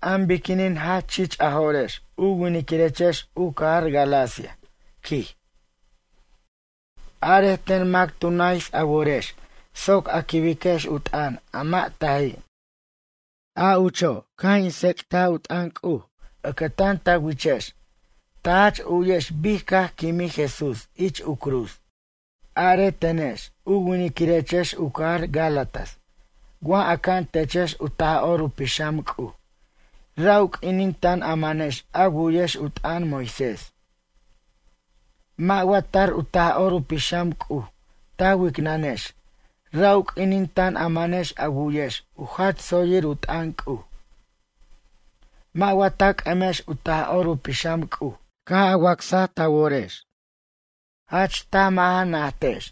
An biquinin jach chich a jo'rex u winiquirechex u cajar Galacia, quij. Arej ten mac tu nays a worex soc a quibiquex u t'ʌn a mʌ' taji'? A ucho' caj in tsec't u t'ʌn C'uj ʌcʌtan ta wichex ta jach u'yex bic caj quimij Jesús ich u cruz. Are tenex u winiquirechex u cajar Gálatas wa aca'an techex u Taj'or u Pixam C'uj ra' u q'uinin tan a manex a wu'yex u t'ʌn Moisés? Mʌ' wa tar u Taj'or Pixam u C'uj ta wicnʌnex ra' u q'uinin tan a manex a wu'yex u jach tsoyir u t'ʌn C'uj? Mʌ' wa ta c'ʌmex u Taj'or u Pixam C'uj caj a wacs ta worex? Jach taj mʌ' ja najtex.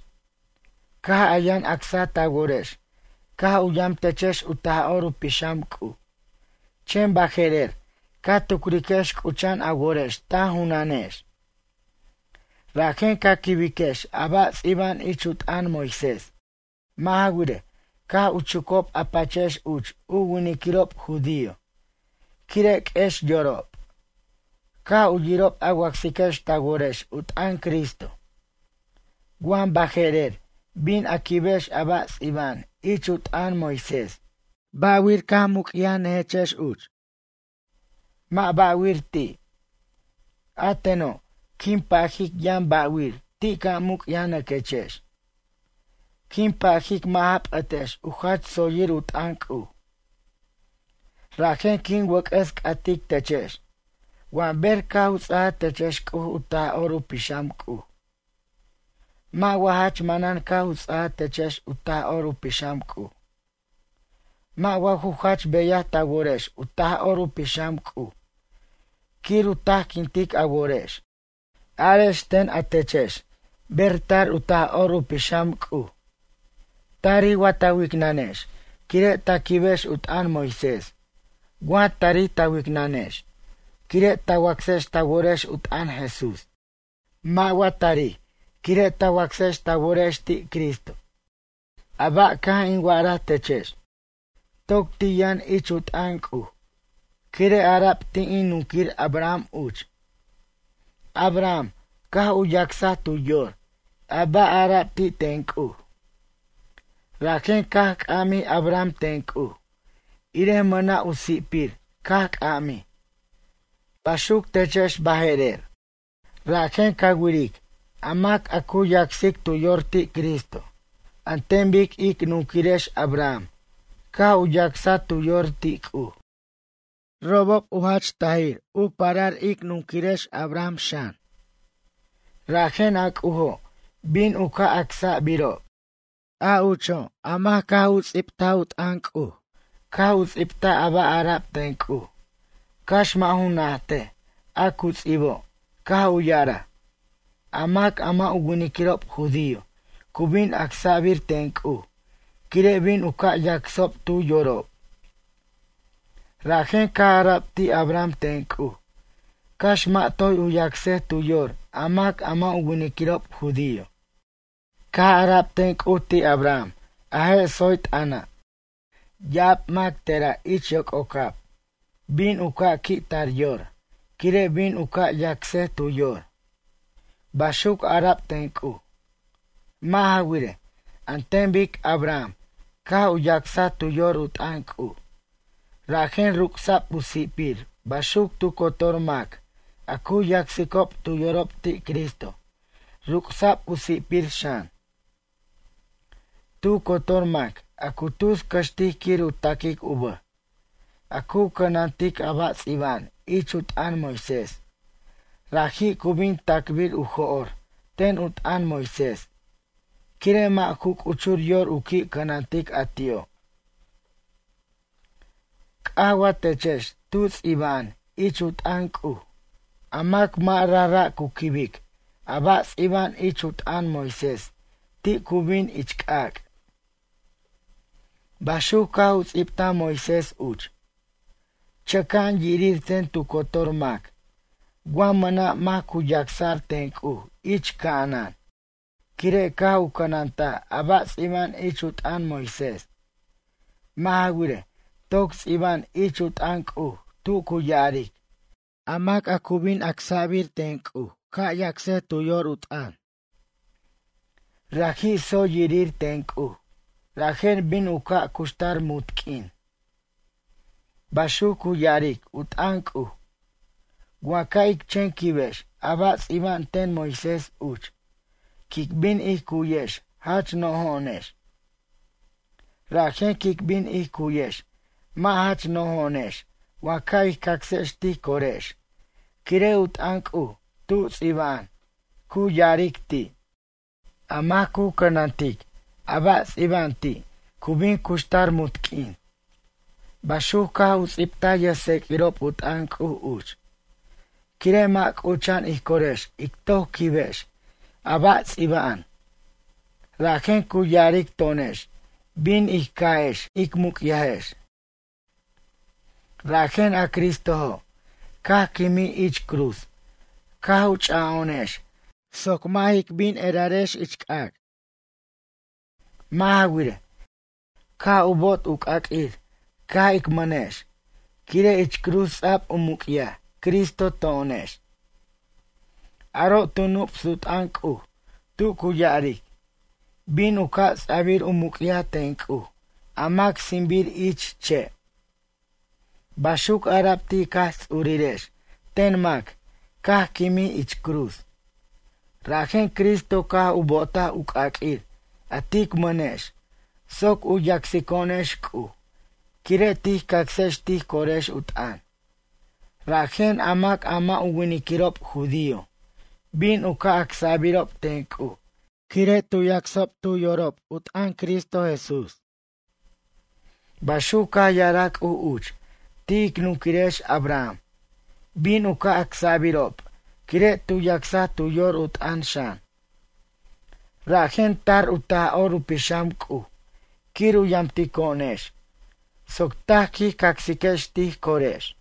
Caj a yʌn acsa ta worex caj u yamt techex u Taj'or u Pixam C'uj. Chen baje'rer ca tucriquex c'ucha'an a worex ta junanex. Rajen ca quibiquex a ba' ts'iba'an ich u t'ʌn Moisés. Mʌ' ja wirej, caj u chucob a pachex uch u winiquirob judío quire' q'uex yorob. Caj u yirob a wacsiquex ta worex u t'ʌn Cristo. Wa baje'rer bin a quibex a ba' ts'iba'an ich u t'ʌn Moisés, ba'wir muc'yajnʌjechex uch? Mʌ' ba'wir ti'. A teno', quin pajic yʌn ba'wir ti' ca' muc'yajnʌjechex. Quin pajic mʌ' ja p'ʌtex u jach tsoyir u t'ʌn C'uj. Rajen quin wʌc'ʌs c'atic techex. Wa ber caj u ts'aja techex C'uj u Taj'or u Pixam C'uj. Mʌ' wa jach manan caj u ts'aj techex u Taj'or u Pixam C'uj? Mʌ' wa ju jach beyaj ta worex u Taj'or u Pixam C'uj quir u tajquintic a worex? Arex ten a techex ber tar u Taj'or u Pixam C'uj? Tarij wa ta wicnʌnex quire' ta quibex u t'ʌn Moisés wa tarij ta wicnʌnex quire' ta wacsex ta worex u t'ʌn Jesús? Mʌ' wa tarij quire' ta wacsex ta worex ti' Cristo. A ba' caj in wa'araj techex toc ti' yʌn ich u t'ʌn C'uj quire' ara'b ti' in nunquir Abraham uch. Abraham caj u yacsa tu yor a ba' arab ti' ten C'uj. Rajen caj c'amij Abraham ten C'uj, irej mʌna' u si'pir caj c'amij. Baxuc techex baje'rer. Rajen ca wiric a mac a cu yacsic tu yor ti' Cristo an ten bic ic nunquirex Abraham caj u yacsaj tu yor ti' C'uj. Robob jach tajir u parar ic nunquirex Abraham xan. Rajen a C'ujo' bin u ca' acsa'birob. A ucho' a mac caj u ts'ibt u t'ʌn C'uj caj u ts'ibtaj a ba' ara'b ten C'uj, cax mʌ' ju najtej a cu ts'ibo' caj u ya'araj: “A mac a mʌ' u winiquirob judío cu bin acsa'bir ten C'uj quire' bin u ca' yacsob tu yorob.” Rajen caj ara'b ti' Abraham ten C'uj cax mʌ' toy u yacsej tu yor a mac a mʌ' u winiquirob judío. Caj ara'b ten C'uj ti' Abraham a je' tsoy t'ʌna': “Ya'ab mac tera' ich yoc'ocab bin u ca' qui' tar yor quire' bin u ca' yacsej tu yor.” Baxuc ara'b ten C'uj. Mʌ' ja wirej, an ten bic Abraham caj u yacsaj tu yor u t'ʌn C'uj, rajen ruc'sa'b u si'pir baxuc tu cotor mac a cu yacsicob tu yorob ti' Cristo, ruc'sa'b u si'pir xan. Tu cotor mac a cu tus cʌxtic quir u taquic u bʌj, a cu cʌnantic a ba' ts'iba'an ich u t'ʌn Moisés, raji' cu bin ta'cbir u jo'r ten u t'ʌn Moisés, quire' mʌ' ju c'uchur yor u qui' cʌnantic a ti'o'. C'aj wa techex tu ts'iba'an ich u t'ʌn C'uj: “A mac mʌ' rajra' cu quibic a ba' ts'iba'an ich u t'ʌn Moisés ti' cu bin ich c'ac'.” Baxuc caj u ts'ibtaj Moisés uch. Chʌca'an yirir ten tu cotor mac wa mʌna' mac cu yacsa'r ten C'uj ich ca'anan quire' caj u cʌnantaj a ba' ts'iba'an ich u t'ʌn Moisés. Mʌ' ja wirej, toc ts'iba'an ich u t'ʌn C'uj tu cu ya'aric: “A mac a cu bin yacsa'r ten C'uj ca' yacsej tu yor u t'ʌn. Raji' tsoy yirir ten C'uj, rajen bin u ca' cuxtar munt q'uin.” Baxuc cu ya'aric u t'ʌn C'uj. Wa ca' ic chen quibex a ba' ts'iba'an ten Moisés uch, quic bin ij cu'yex jach no'jo'onex. Rajen quic bin ij cu'yex mʌ' jach no'jo'onex wa ca' ij cacsex tij corex quire' u t'ʌn C'uj tu ts'iba'an cu ya'aric ti': “A mac cu cʌnantic a ba' ts'iba'an ti' cu bin cuxtar munt q'uin.” Baxuc caj u ts'ibtaj yʌjtseq'uirob u t'ʌn C'uj uch. Quire' mʌ' c'ucha'an ij corex ic toc quibex a ba' ts'iba'an. Rajen cu ya'aric to'onex bin ij ca'ex ic bin ic muc'yajex. Rajen a Cristojo', caj quimij ich cruz caj u cha'o'onex soc mʌ' jic bin erarex ich c'ac'. Mʌ' ja wirej, caj u bo'ot u c'aq'uir caj ic mʌnex, quire' ich cruz ts'a'b u muc'yaj Cristo to'onex. Aro' tu nups u t'ʌn C'uj tu cu ya'aric: “Bin u ca' ts'a'bir u muc'yaj ten C'uj a mac sinbir ich che'.” Baxuc ara'b ti' ic Jaj Ts'urirex ten mac caj quimij ich cruz. Rajen Cristo caj u bo'otaj u c'aq'uir a tic mʌnex soc u yacsico'onex C'uj quire' tij cacsex tij corex u t'ʌn, rajen a mac a mʌ' u winiquirob judío bin u ca' acsa'birob ten C'uj quire' cu yacsob tu yorob u t'ʌn Cristo Jesús. Baxuc caj ya'araj C'uj uch ti' ic nunquirex Abraham, bin u ca' acsa'birob quire' tu yacsaj tu yor u t'ʌn xan. Rajen tar u Taj'or u Pixam C'uj quir u yamtico'onex soc taj quij cacsiquex tij corex.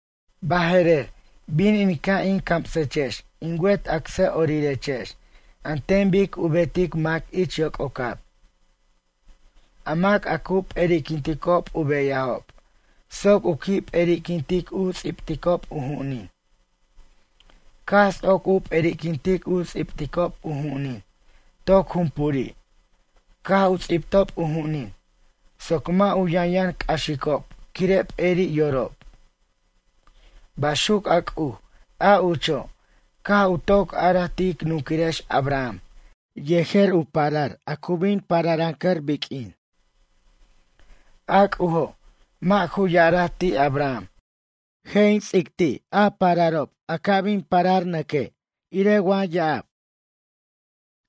Baje'rer bin in ca' in camsechex in wet acsʌ'orirechex an ten bic u betic mac ich yoc'ocab. A mac a cu p'eri'quinticob u beyajob soc u qui' p'eri'quintic u ts'ibticob u ju'unin. Caj ts'oc u p'eri'quintic u ts'ibticob u ju'unin toc junpuri' caj u ts'ibtob u ju'unin soc mʌ' u yʌnyʌn c'axicob quire' p'eri' yorob. Baxuc a C'uj a ucho', caj u toc araj ti' ic nunquirex Abraham yejer u parar a cu bin u pararʌncʌr biq'uin. A C'ujo' mʌ' ju ya'araj ti' Abraham: “Je' in ts'ic ti' a pararob a ca bin pararʌncʌr”; irej wa ya'ab.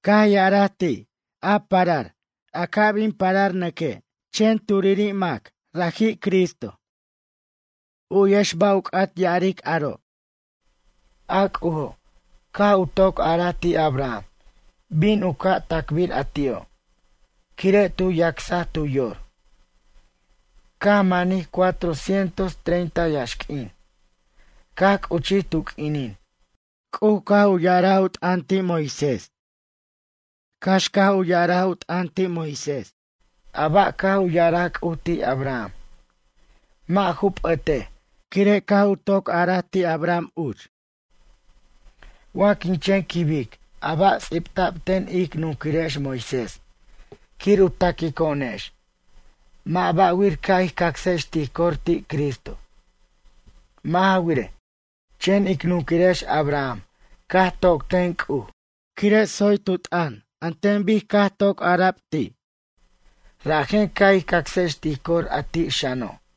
Caj ya'araj ti': “A parar a ca bin a pararʌncʌr”; chen turiri' mac, Cristo. U'yex ba' u c'at ya'ar aro'. A C'ujo' caj u toc araj ti' Abraham bin u ca' tacbir a ti'o', quire' tu yacsaj tu yor. Caj manij cuatro cientos treinta yaxq'uin caj c'uchij tu q'uinin C'uj caj u ya'ar u t'ʌn ti' Moisés. Cax caj u ya'ar u t'ʌn ti' Moisés, a ba' caj u ya'araj C'uj ti' Abraham, mʌ' ju p'ʌtej quire' caj u toc ara'b ti' Abraham uch. Wa quin chen quibic a ba' ts'ibta'b ten ic nunquirex Moisés quir u taquico'onex mʌ' ba' wir ca' ij cacsex tij cor ti' Cristo. Mʌ' ja wirej, chen ic nunquirex Abraham caj toc ten C'uj quire' tsoy tu t'ʌn an ten bic caj u toc ara'b ti'. Rajen ca' ij cacsex tij cor a ti' xano'.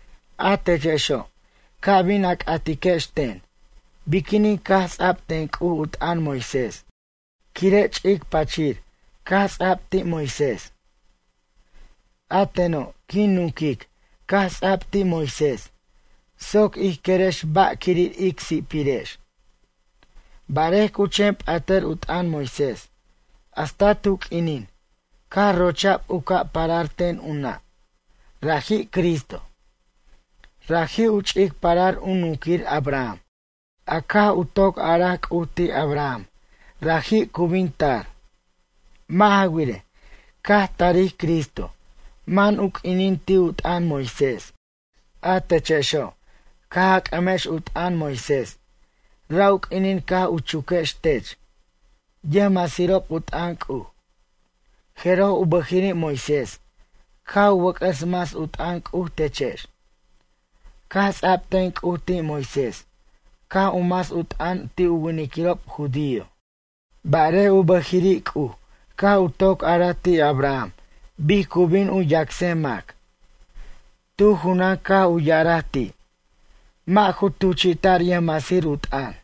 A techexo', ca bin a c'atiquex ten: Biquinin caj ts'a'b ten C'uj u t'ʌn Moisés quire' ch'ic pachir caj ts'a'b ti' Moisés? A teno' quin nunquic caj ts'a'b ti' Moisés soc ij querex ba' quirir ic si'pirex. Barej cu chen p'atʌr u t'ʌn Moisés hasta tu q'uinin caj rocha'b u ca' parar ten u nʌ', raji' Cristo. Raji' u ch'ic parar u nunquir Abraham a caj u toc araj C'uj ti' Abraham raji' cu bin tar. Mʌ' ja wirej, caj tarij Cristo man u q'uinin ti' u t'ʌn Moisés. A techexo', caj a c'ʌmex u t'ʌn Moisés ra' u q'uinin caj u chuquex tech yʌjmasirob u t'ʌn C'uj. Jeroj u bʌjiri' Moisés caj u wʌc'ʌs mas u t'ʌn C'uj techex. Caj ts'a'b ten C'uj ti' Moisés caj u mas u t'ʌn ti' u winiquirob judío. Barej u bʌjiri' C'uj caj u toc araj ti' Abraham bic cu bin u yacsej mac. Tu junan caj u ya'araj ti'. Mʌ' ju tuchi'ta'r yʌjmasir u t'ʌn.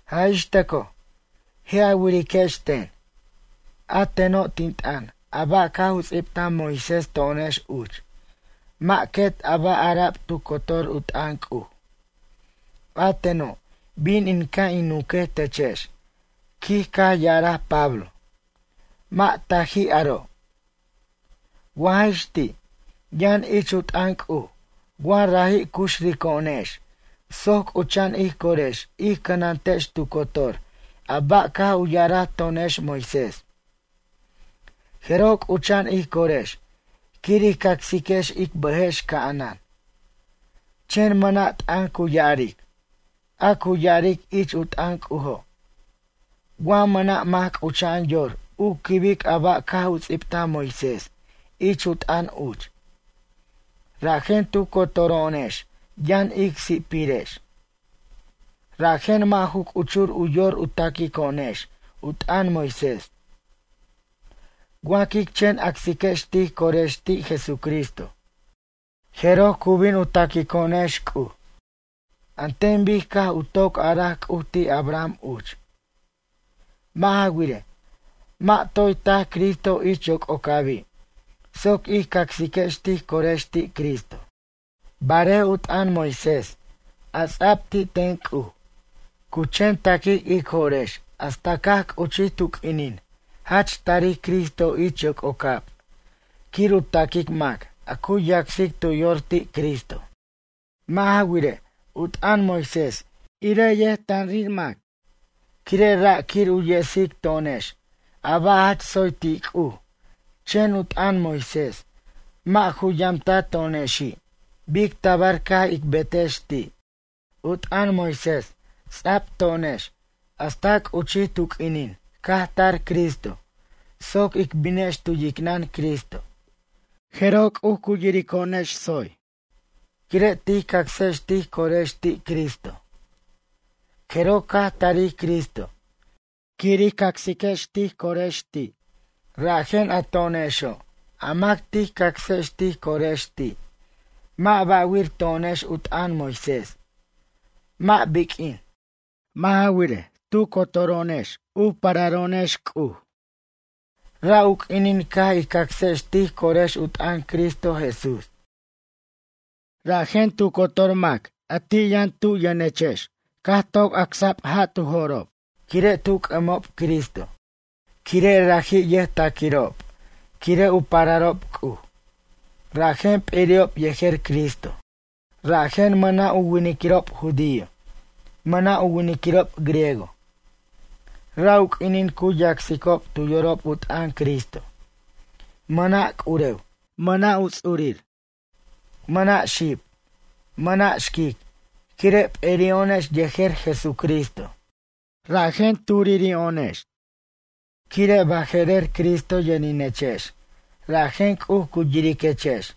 Jaj ix tʌco, je' a wa'ariquex ten: “A teno', tin t'ʌn a ba' caj u ts'ibtaj Moisés to'onex uch mʌ' quet a ba' ara'b tu cotor u t'ʌn C'uj.” A teno' bin in ca' in nunquej techex, quij caj ya'araj Pablo: “Mʌ' taji' aro'.” Wa jaj ix ti', yʌn ich u t'ʌn C'uj wa raji' cuxrico'onex soc c'ucha'an ij corex ij cʌnantex tu cotor a ba' caj u ya'araj to'onex Moisés. Jeroj c'ucha'an ij corex quir ij cacsiquex ic bʌjex ca'anan. Chen mʌna' t'ʌn cu ya'aric. A cu ya'aric ich u t'ʌn C'ujo', wa mʌna' mac c'ucha'an yor u quibic a ba' caj u ts'ibtaj Moisés ich u t'ʌn uch. Rajen tu cotoro'onex yʌn ic si'pirex. Rajen mʌ' ju c'uchur u yor u taquico'onex u t'ʌn Moisés. Wa quic chen acsiquex tij corex ti' Jesucristo, jeroj cu bin u taquico'onex C'uj, an ten bic caj u toc araj C'uj ti' Abraham uch. Mʌ' ja wirej, mʌ' toy tac Cristo ich yoc'ocabi' soc ij cacsiquex tij corex ti' Cristo. Barej u t'ʌn Moisés a ts'a'b ti' ten C'uj, cu chen taquic ic jo'rex hasta caj c'uchi tu q'uinin jach tarij Cristo ich yoc'ocab quir u taquic mac a cu yacsic tu yor ti' Cristo. Mʌ' ja wirej, u t'ʌn Moisés irej yʌjtanrir mac, quire' ra' quir u yesic to'onex a ba' jach tsoy ti' C'uj chen u t'ʌn Moisés mʌ' ju yamta to'onexi' bic tabar ca' ic betex ti'. U t'ʌn Moisés ts'a'b to'onex hasta c'uchij tu q'uinin caj tar Cristo soc ic binex tu yicnʌn Cristo. Jeroj C'uj cu yirico'onex tsoy, quire' tij cacsex tij corex ti' Cristo. Jeroj caj tari Cristo quir ij cacsex tij corex ti', rajen a to'onexo' a mac tij cacsex tij corex ti', mʌ' ba'wir to'onex u t'ʌn Moisés, mʌ' biq'uin. Mʌ' ja wirej, tu cotoro'onex u pararex C'uj, ra' u q'uinin caj ij cacsex tij corex u t'ʌn Cristo Jesús. Rajen tu cotor mac a ti' yʌn tu yʌnex caj toc acsa'b ja' tu jo'rob quire' tu c'ʌmob Cristo quire' raji' ʌjtaquirob quire' u pararob C'uj, rajen p'eri'ob yejer Cristo. Rajen mʌna' u winiquirob judío, mʌna' u winiquirob griego. Ra' u q'uinin cu yacsicob tu yorob u t'ʌn Cristo. Mʌna' c'urew, mʌna' u ts'urir. Mʌna' xib, mʌna' xquic quire' p'eri'o'onex yejer Jesucristo rajen turiro'onex. Quire' baje'rer Cristo yʌninechex, rajen C'uj cu yiriquechex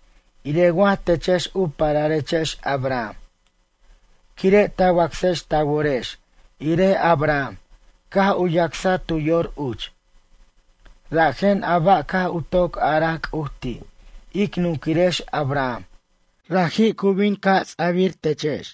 irej wa techex u pararechex Abraham. Quire' ta wacsex ta worex irej Abraham caj u yacsaj tu yor uch. Rajen a ba' caj u toc a'araj C'uj ti' ic nunquirex Abraham, raji' cu bin u ca' ts'abir techex.